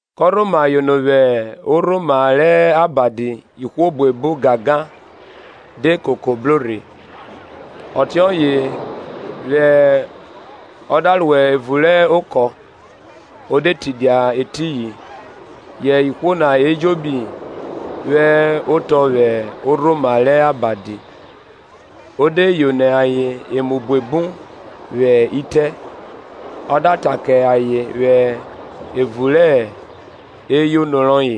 Kọ rhoma yono vwẹ orhoma rẹ abadi, ihwo buebu gangan de koko bro rhe, ọtiọye re ọ da ro evun rẹ okọ, o de tidia etiyin; yẹ ihwo na ejobi hẹ otọ vwẹ orhoma rẹ abadi. Ọ de yono ayen emu buebu vwẹ itẹ, ọ da ta kẹ ayen vwẹ evun rẹ eyono rọye.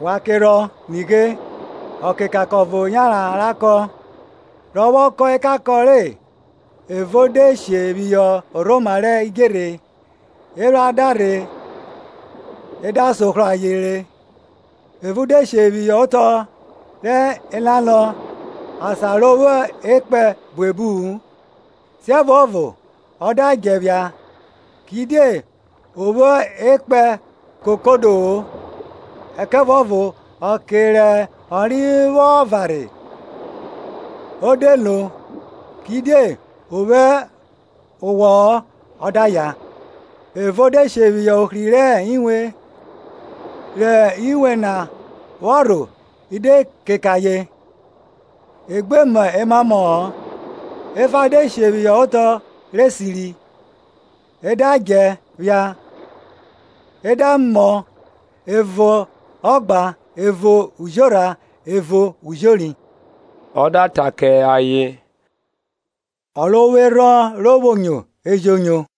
Wa kerhọn Nighe, ọkekankọn ọvo yanran ra kọn; rọ vwọ kọn ekankọn re, ẹvo de she phihọ orhoma rẹ idjerhe, ephran da rhe e da sohrọ ayen re. Ẹvo de she phihọ otọ rẹ elalọ, asan ro vwo ekpẹn buebu-u; siẹvuọvo ọ da djẹ phia, kidie o vwo ekpẹn kokodo-o; ẹkẹvuọvo ọke re ọnre vwọ varhẹ, o de vwioro; kidie o vwo owọ-ọ; ọ da ya. Ẹvo de she phihọ ohri rẹ inwe, rẹ inwe na vwọ rho i de keke ayen, e gbe mọ emamọ-ọ. Efa de she phihọ otọ rẹ esiri, e da djẹ phia, ẹ da mọ, ẹvo ọgban, ẹvo ujorha, ẹvo ujori. Ọ da ta kẹ ayen, o ro vwo erhọn ro vwo nyo, e jo nyo.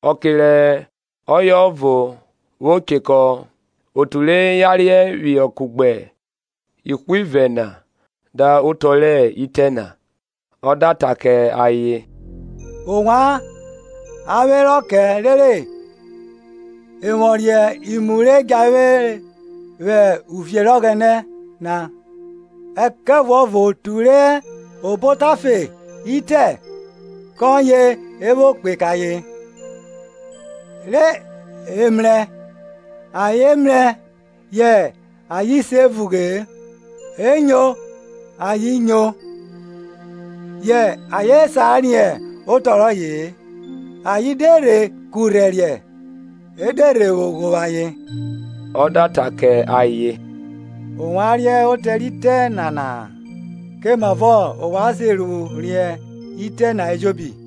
Ọke rẹ ọye ọvo vwo chekọ otu re yarierẹ họ kugbe ihwivẹ na da nọ otọ rẹ itẹ na. Ọ da ta kẹ ayen, ovwan a vwẹ rọ kẹ rere e vwọ riẹn imu re djahere vwẹ uvie rẹ Ọghẹnẹ na; ẹkẹvuọvo otu re hẹ obo otafe itẹ kọye e vwo kpe kẹ ayen, re emrẹ ayen mrẹ yẹ ayen se vughe-e, enyo ayen nyo, yẹ ayen sa riẹn otọ rọye-e; ayen de rhe kurhẹriẹ e de rhe vwo ghovwo ayen. Ọ da ta kẹ ayen, ovwan riẹn otọ re itẹ nana-a? Kẹ mavọ ovwan se ru riẹn itẹ na ejobi?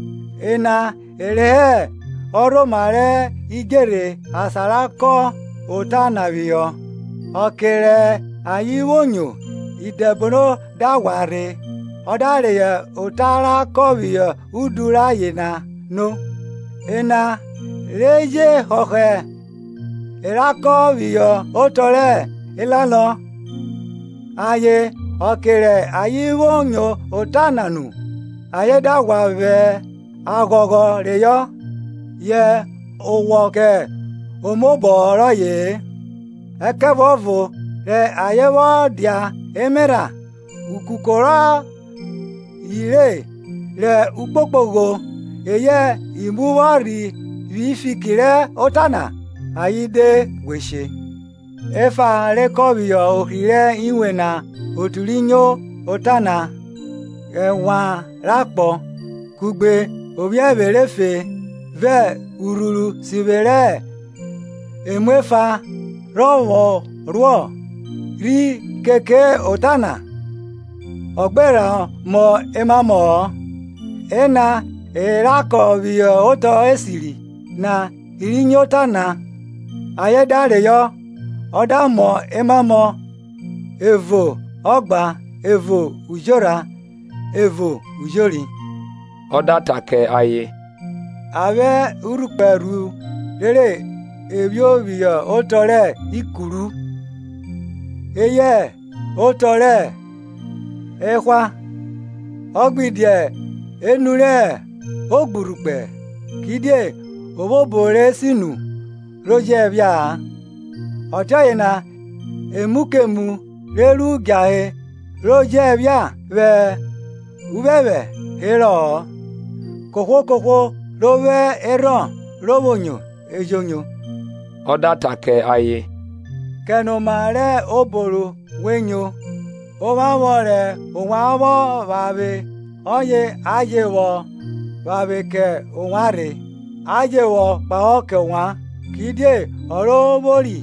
Ena e re hẹ orhoma rẹ idjerhe asan ra kọn ota na phihọ; ọke re ayen vwo nyo, Idẹbono da ghwa rhe, ọ da reyọ ota ra kọn phihọ udu rẹ ayen na no. Ena re je họhọ e ra kọn phihọ otọ rẹ elalọ, ayen, ọke rẹ ayen vwo nyo ota na nu, ayen da ghwa vwẹ aghọghọ reyọ; yẹ o vwo owọ kẹ omaobọ rọye-e, ẹkẹvuọvo rẹ ayen vwọ dia emerha; ukuko rọye re, re ukpokpogho eyẹ imu vwọ rhe vwi fiki rẹ ota na, ayen de ghwe she. Efa ra kọn phihọ ohri rẹ inwe ena otu ri nyo ota na, Rẹ ẹnwan rẹ akpọ, kugbe ophiẹvwe rẹ efe, vẹ urhuru sivwe rẹ emuefa rhe vwọ ruọ, rhi keke ota na, ọ gbe rha mọ emamọ-ọ. Ena e ra kọn phihọ otọ esiri na i ri nyo ota na, ayen da reyọ, ọ da mọ emamọ, ẹvo ọgban ẹvo ujorha, ẹvo ujori. Ọ da ta kẹ ayen, A vwẹ urhukpẹ rhu rere e phio phihọ otọ rẹ ikuru, eyẹ otọ rẹ ehwa, ọ gbe dia enu rẹ ogburhukpẹ? Kidie o vwo obo re sinu, ro jẹphia-a, ọtiọye na emu kemu re ru djahe ro je phia vwẹ uphẹphẹ herọ-ọ, Kohwo Kohwo ro vwo erhọn ro vwo nyo e jo nyo. Ọ da ta kẹ ayen, kẹnoma rẹ obo ru we nyo; ovwanvwọn rẹ ovwan vwọ vwanvwe ọye a je vwọ vwanvwe kẹ ovwan rhe. a jẹ vwọ kpahọ kẹ ovwan. Kidie ọ ro vwori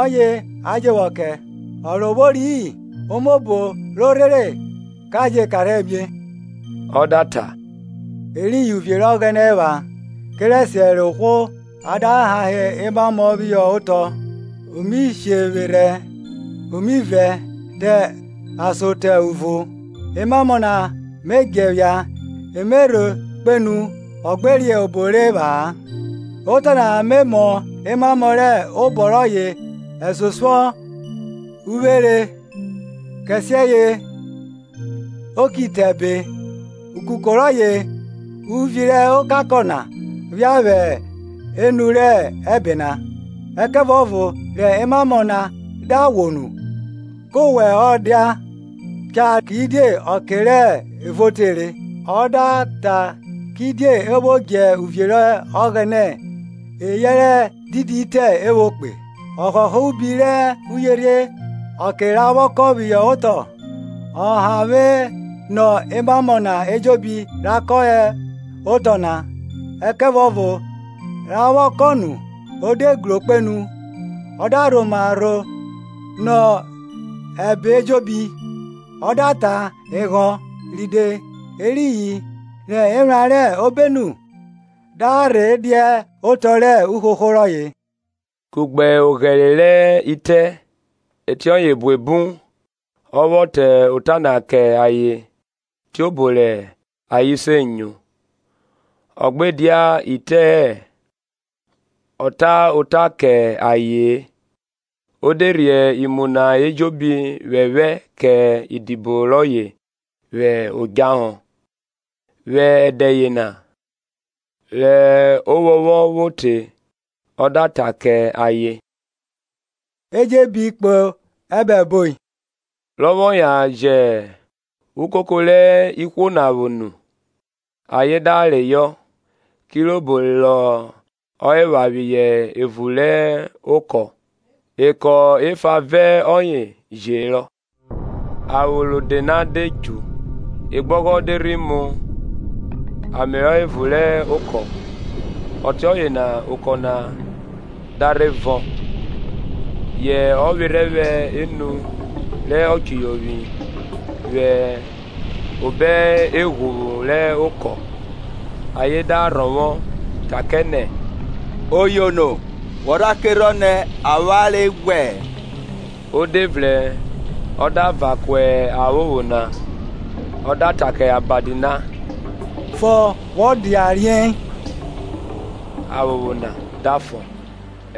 ọye a je vwọ kẹ, o ro vwori-i, omobo ro rhere ka je karhiẹ mie. Ọ da ta, Eriyin uvie rẹ Ọghẹnẹ epha, kerẹsiẹ rẹ ohwo a da hahe emamọ phihọ otọ; o mi shevwerhẹ o mi vrẹn te ason te uvo, emamọ na me djẹ phia e Me rho kpenu ọ gbe riẹn obo re epha-a. Otọ na Me mọ emamọ rẹ obọ rọye ẹsosuọ uvwere, kẹsiẹye o ki te ẹbe, ukuko rọye uvi rẹ ọka kọ phia vwe enu rẹ ẹbe na. Ẹkẹvuọvo rẹ emamọ na da ghwo nu, koọ vwẹ oda cha kidie ọke rẹ evuo tere. Ọ da ta kidie e vwo dje uvie rẹ Ọghẹnẹ eyẹrẹ didi itẹ e vwo kpe? Ọ họhọ ubi rẹ uyerhie ọke ra vwọ kọn phihọ otọ; ọ havwe nọ emamọ na ejobi ra kọn hẹ otọ na, ẹkẹvuọvo ra vwọ kọn nu, o de gro kpenu, ọ da rhoma rho nọ ẹbe ejobi, ọ da tan eghọn ride, eriyin re ephran rẹ obenu da rhe dia otọ rẹ uhoho rọye. Kugbe oghẹre rẹ itẹ ẹtiẹye buebu ọ vwọ ta ota na kẹ ayen tiobo rẹ ayen se nyo; Ọ gbe dia ite-e ọ ta ota kẹ aye-en; o de rhie imu na ejobi phẹphẹ kẹ idibo rọye vwẹ odjahọ. Vwẹ ẹdẹ yena, rẹ ovwọnvwọn vwo te, ọ da ta kẹ ayen, E jẹn e bi kpo obo esamuo. Rọ vwọ yan jẹ ukoko re ihwo na vwo nu, ayen da reyọ, kirobo rọ epha phihọ evun rẹ oko. Ekpo efa vẹ ọye je herọ. Aphopho rode na de dju, ọgbogho de rhi mu ame ro evun rẹ okọ, ọtiọye na okọ na da rhe vọn. Yẹn ọ vwerhẹ vwẹ enu rẹ ọchuyovwi vwẹ obo eghuvwu rẹ okọ, ayen da rhọvwọ, ta kẹ nẹ, Oyono, wọ rha kerhọn nẹ avwanre ghwẹ? O de vrẹn ọ da van ku aphopho na, ọ da ta kẹ abadi na, Fọ, wọ dia riei Aphopho na da fọ,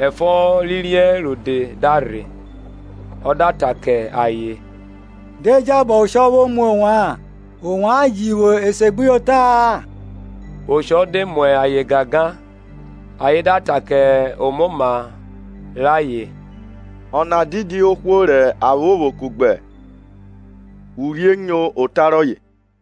ẹfọ ri riei rode da rhe. Ọ da ta kẹ ayen, Die jabọ oshọ vwo mu ovwan? ovwan ji vwo esegbuyota-a? Oshọ de mu ayen gangan, ayen da ta ke omoma rẹ ayen, Ọna didi ohwo rẹ aphopho kugbe urhie nyo ota rọye?